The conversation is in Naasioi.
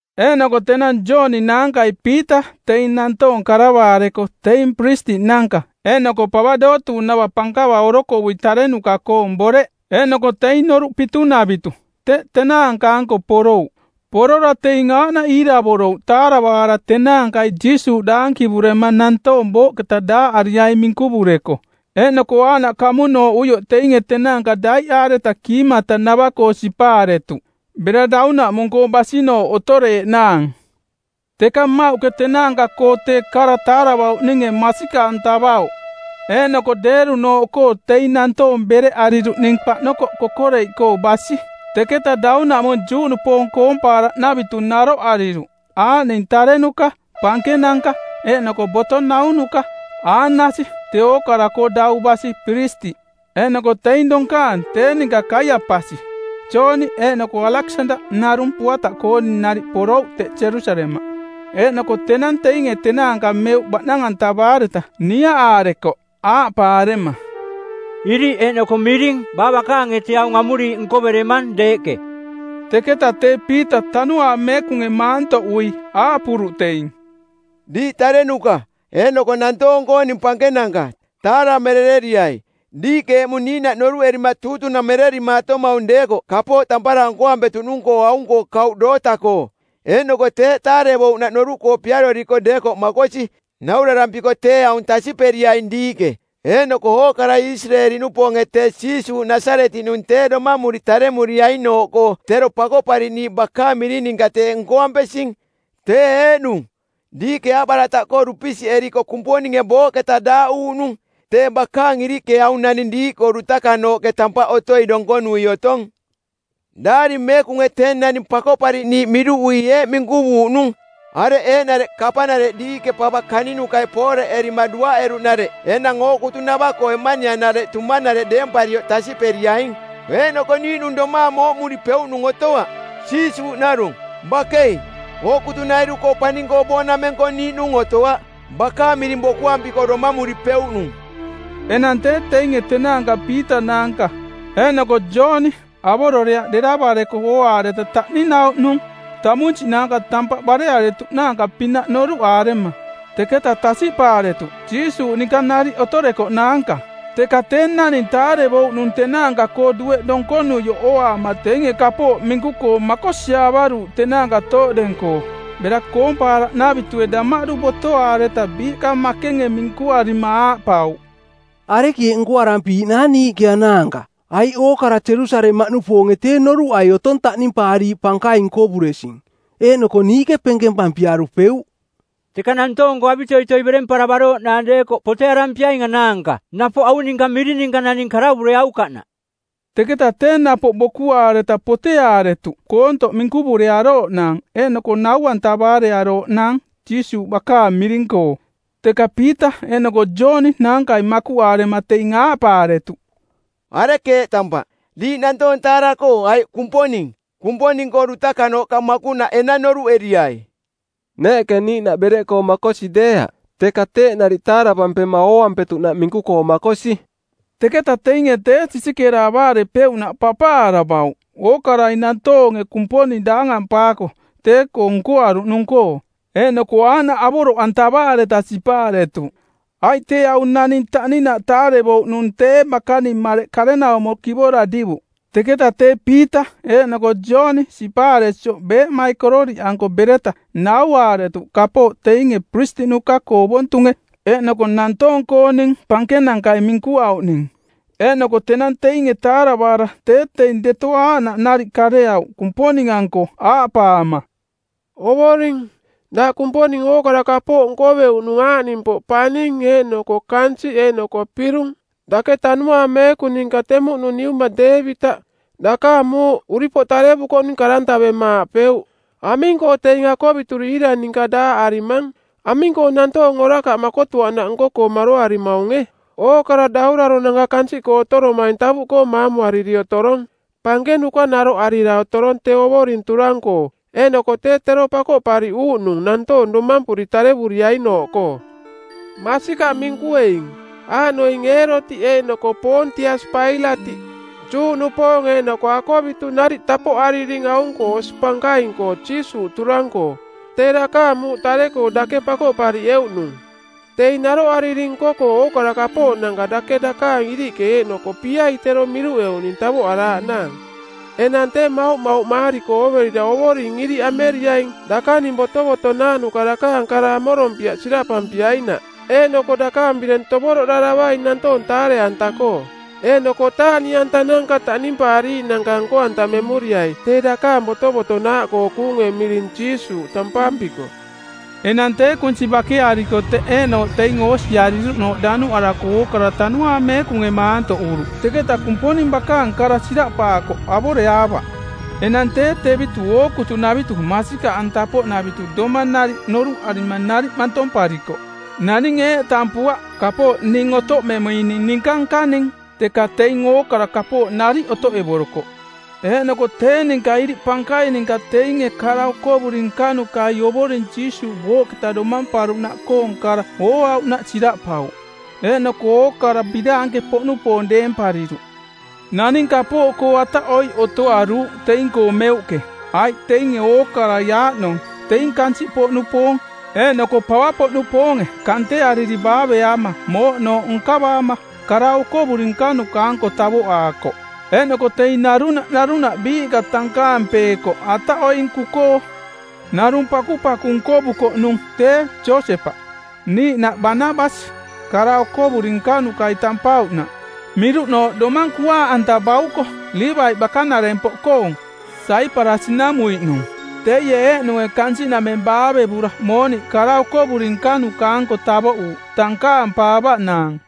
Eeꞌnoko tenang Jooni naankai Piita teing nantoong karavaareko teing piristiꞌnanka eeꞌnoko pava dootuuꞌnava pankava orokovui tarenuka˜koong boreꞌ eeꞌnoko teing Noruꞌ Pitunavitu˜ teꞌ tenaanka-anko porouꞌ. Porora teing aaꞌnaꞌ iiravorouꞌ taaravaara tenaankai Jiisuuꞌ daankivurema nantoong booꞌketa daaꞌariaing minkuvureko. Eeꞌnoko aaꞌnaꞌ kamunooꞌuioꞌ teinge tenaanka daiꞌaareta kiimatanavaꞌkoo sipaaretuꞌ bera daunaꞌmung-koo basinooꞌ otoreeꞌnaang. Teka mmauꞌke tenaanka-koo tee kara taaravauꞌninge masikaꞌantavauꞌ. Eeꞌnoko deerunooꞌkoo teing nantoong bereꞌariruꞌning paꞌnokoꞌ kokoreiꞌkoo˜ basi. Teketa daunaꞌmung Juꞌnupoong koompaaraꞌnavitu naroꞌariruꞌ aaꞌning tarenuka, pankenanka eeꞌnoko boto naunuka. Aanasi, tee ookara-koo dau basi piristiꞌ, eeꞌnoko teing donkaang tee ninka Kaiapasi, Jooni eeꞌnoko Aleksandaꞌ narung puataꞌkooning nariꞌ porouꞌ teꞌ Jerusalemaꞌ. Eeꞌnoko tenang teinge tenaanka meuꞌ baꞌnang-antavaareta niaꞌaarekoꞌ aaꞌpaarema, “Iriꞌ eeꞌnoko miring baa bakaange tee aung amuriiꞌ nkoveremang deeꞌke?” Teketaꞌ tee Piita Tanuaang Meekunge maantoꞌui aaꞌpuruꞌ teing, “Diiꞌ tarenuka eeꞌnoko nantoong-kooning pankenanka, taaramerereriai. Diiꞌke eꞌmung niiꞌnaꞌ noruꞌerima tuutunamererimaatomaung deekoꞌ kapooꞌ tampara nkoampetuꞌnung-koo aung-koo kauꞌ doota-koo, eeꞌnoko teeꞌ taarevouꞌnaꞌ noruꞌkoo piaroriko deekoꞌ makosi. Naurarampiko tee aung tasiꞌperiaing diiꞌke eeꞌnoko ookarai Isireeli-nupoonge tee Jiisuuꞌ Nasaretiꞌnung tee Domamuri Taremuriainooꞌkoo Tero Pakoꞌpariꞌniiꞌ bakaang miring ninka teeꞌ nkoampesing. Tee eeꞌnung, diiꞌke aaꞌbarataꞌkoo dupisiꞌeriko Kumponinge booꞌketa daaꞌuuꞌnung, tee bakaang iriꞌke aung naning diiꞌkoo dutakanooꞌke tampaꞌ otoi donkonui otong. Daari Meekunge tee naning Pakoꞌpariꞌniiꞌ miruꞌui eeꞌ minkuvuuꞌnung, ‘Areꞌ eeꞌnareꞌ kapanareꞌ diiꞌke pava kaninukai pooreꞌerima duaꞌeruꞌnareꞌ enang ookutunava-koo eꞌmanianareꞌ tumanareꞌ deemparioꞌ tasiꞌperiaing!’ Eeꞌnoko niiꞌnung domaang mooꞌmuripeuꞌnung otoaꞌ, Jiisuuꞌ narung. Bakei, ookutunairu-koo paning-koo boonameng-koo niiꞌnung otoaꞌ bakaang miring bokuampiko domamuripeuꞌnung.” Enang tee teinge tenaanka Piita naanka eeꞌnoko Jooni avororeaꞌ deravareko ooaareta taꞌninauꞌnung, tamunsiꞌnaanka, tampaꞌ barearearuuꞌnaanka-pinaꞌ noruꞌaarema. Teketa tasiꞌpaaretuꞌ Jiisuuꞌ ninka nariꞌ otorekoꞌnaanka. Teka tee naning taarevouꞌnung tenaanka-koo dueꞌ donkonuioꞌ ooaama teinge kapooꞌ minku-koo makosiaavaruuꞌ tenaanka tooꞌdeng-koo. Bera koompaaraꞌnavitue damaꞌdu botoaareta biiꞌka makenge minkuarima aaꞌpauꞌ, “Arekeeꞌ nkoarampiiꞌnaang niiꞌke anaanka? Aiꞌ ookara Jerusalemaꞌnupoonge tee noruꞌai otong taꞌnimpaariiꞌ pankaing nkovuresing, eeꞌnoko niiꞌke penkempampiarupeuꞌ. Teka nantoong-koo avitoitoi beremparavarooꞌnaang deekoꞌ potearampiaing anaanka napoꞌ aung ninka miring ninka naning karavureaukaꞌnaꞌ.” Teketa tee napoꞌ bokuaareta poteaaretuꞌ koontoꞌ minkuvurearooꞌnaang eeꞌnoko nau-antavaarearooꞌnaang Jiisuuꞌ bakaang miring-koo. Teka Piita eeꞌnoko Jooni naankai makuꞌaarema teing aaꞌpaaretuꞌ, “Arekeeꞌ tampaꞌ, diiꞌ nantoong taara-koo aiꞌ Kumponing? Kumponing-koo dutakanooꞌka makuꞌnaꞌ enang noruꞌeriai. Neeꞌke niiꞌnaꞌ bereꞌkoo makosi deeaꞌ, teka teeꞌ nariꞌ taaravampema ooampetuꞌnaꞌ minku-koo makosi.” Teketa teinge tee sisikeera avaarepeuꞌnaꞌ papaaravauꞌ, ookarai nantoonge Kumponing daangampaako tee-koo nkoaruꞌnung-koo. Eeꞌnoko aaꞌnaꞌ avoroꞌantavaareta sipaaretuꞌ. Aiꞌ tee aung naning taꞌninaꞌ taarevouꞌnung tee bakaning mareꞌ karenaumo kivora divuꞌ. Teketa tee Piita eeꞌnoko Jooni sipaaresioꞌ beeꞌmaikororiꞌanko bereta nauaaretuꞌ kapooꞌ teinge piristiꞌnuka-koo ovontunge eeꞌnoko nantoong-kooning pankenankai minkuauꞌning. Eeꞌnoko tenang teinge taaravaara tee teing deto aaꞌnaꞌ nariꞌ kareauꞌ Kumponing-anko aaꞌpaama, “Ovoring, daꞌ Kumponing ookara kapooꞌ nkoveuꞌnung aaꞌnimpoꞌ, paning eeꞌnoko kansiꞌ eeꞌnoko pirung. Dake Tanuaang Meekung ninka temuꞌnung niuma Deevitaꞌ, dakaang muuꞌ uripoꞌ tarevukoꞌnung, karantavema aaꞌpeuꞌ, ‘Aming-koo teing akovituri iira ninka daaꞌarimang? Aming-koo nantoong orakaꞌ makotuaꞌnaꞌ nko-koo maroarimaunge! Ookara dauraronanka kansiꞌkoo otoromaing tavuꞌkoo maamuariri otorong. Pankenuka naroꞌarira otorong tee Ovoring turang-koo eeꞌnoko tee tero Pakoꞌpariꞌuuꞌnung nantoong domampuri tarevuriainooꞌkoo.’ “Masikaꞌ minkueing, aaꞌnoing Eerotiꞌ eeꞌnoko Poontiasi Pailatiꞌ, Juꞌnupoong eeꞌnoko akovitu nariꞌ tapoꞌariring aung-koo osi pankaing-koo Jiisuuꞌ turang-koo, tee dakaang muuꞌ tare-koo dake pakoꞌpariꞌeuꞌnung. Teing naroꞌariring nko-koo ookara kapooꞌnanka dake dakaang iriꞌke eeꞌnoko piai tero miruꞌeuꞌning tavoꞌaraaꞌnaang. Enang tee mauꞌmauꞌmaariko ooverira Ovoring iriꞌ ameriaing dakaning botovotonaaꞌnuka dakaang kara amorompiaꞌ siraꞌpampiainaꞌ. Eeꞌnoko dakaang bireng tovoroꞌdaravaing nantoong taare-anta-koo, eeꞌnoko taaꞌniꞌantananka taꞌnimpaariiꞌnanka nko-antamemuriai tee dakaang botovotonaaꞌkoo kuunge miring Jiisuuꞌ tampampiko.” Enang tee kunsi bakeariko teꞌ eeꞌnooꞌ teing oosiariruꞌnooꞌ danuꞌarako ookara Tanuaang Meekunge maantoꞌuruꞌ, teketa Kumponing bakaang kara siraꞌpaakoꞌ avoreaavaꞌ. Enang tee tevitu ookutunavitu masikaꞌanta-poꞌnavitu domang nariꞌ noruꞌarima nariꞌ mantomparikoꞌ. Naninge eeꞌ tampuaꞌ: Kapooꞌ ning otoꞌmemuining ninka nkaning, teka teing ookara kapooꞌ nariꞌ otoꞌevorokoꞌ. Eeꞌnoko tee ninka iriꞌ pankaing ninka teinge kara okovuri nkanukai Ovoring Jiisuuꞌ booꞌketa domamparuꞌnaꞌkoong kara ooauꞌnaꞌ siraꞌpauꞌ, eeꞌnoko ookara biraanke-poꞌnupoong deempariruꞌ. Naning kapooꞌkoo ataꞌoiꞌ otoaruuꞌ teing-koo meuꞌke, aiꞌ teinge ookarai aaꞌnong teing kansiꞌpoꞌnupoong eeꞌnoko pavapoꞌnupoonge kanteariri baaveaama mooꞌnooꞌ nkavaama kara okovuri nkanuka-anko tavoꞌaakoꞌ. Eeꞌnoko teing narunaꞌ narunaꞌ biiꞌka tankaampeekoꞌ ataꞌoinku-koo. Narung pakupaku nkovukoꞌnung tee Josepaꞌ, niiꞌnaꞌ “Banabasi” kara okovuri nkanukai tampauꞌnaꞌ (miruꞌnooꞌ: domang kuaaꞌanta bauko) Liivaiꞌ bakanarempoꞌkoong, Saiparasi-namuiꞌnung. Teie eeꞌnunge kansiꞌnameng baavevura mooniꞌ kara okovuri nkanuka-anko tavoꞌuuꞌ tankaampaavaꞌnaang.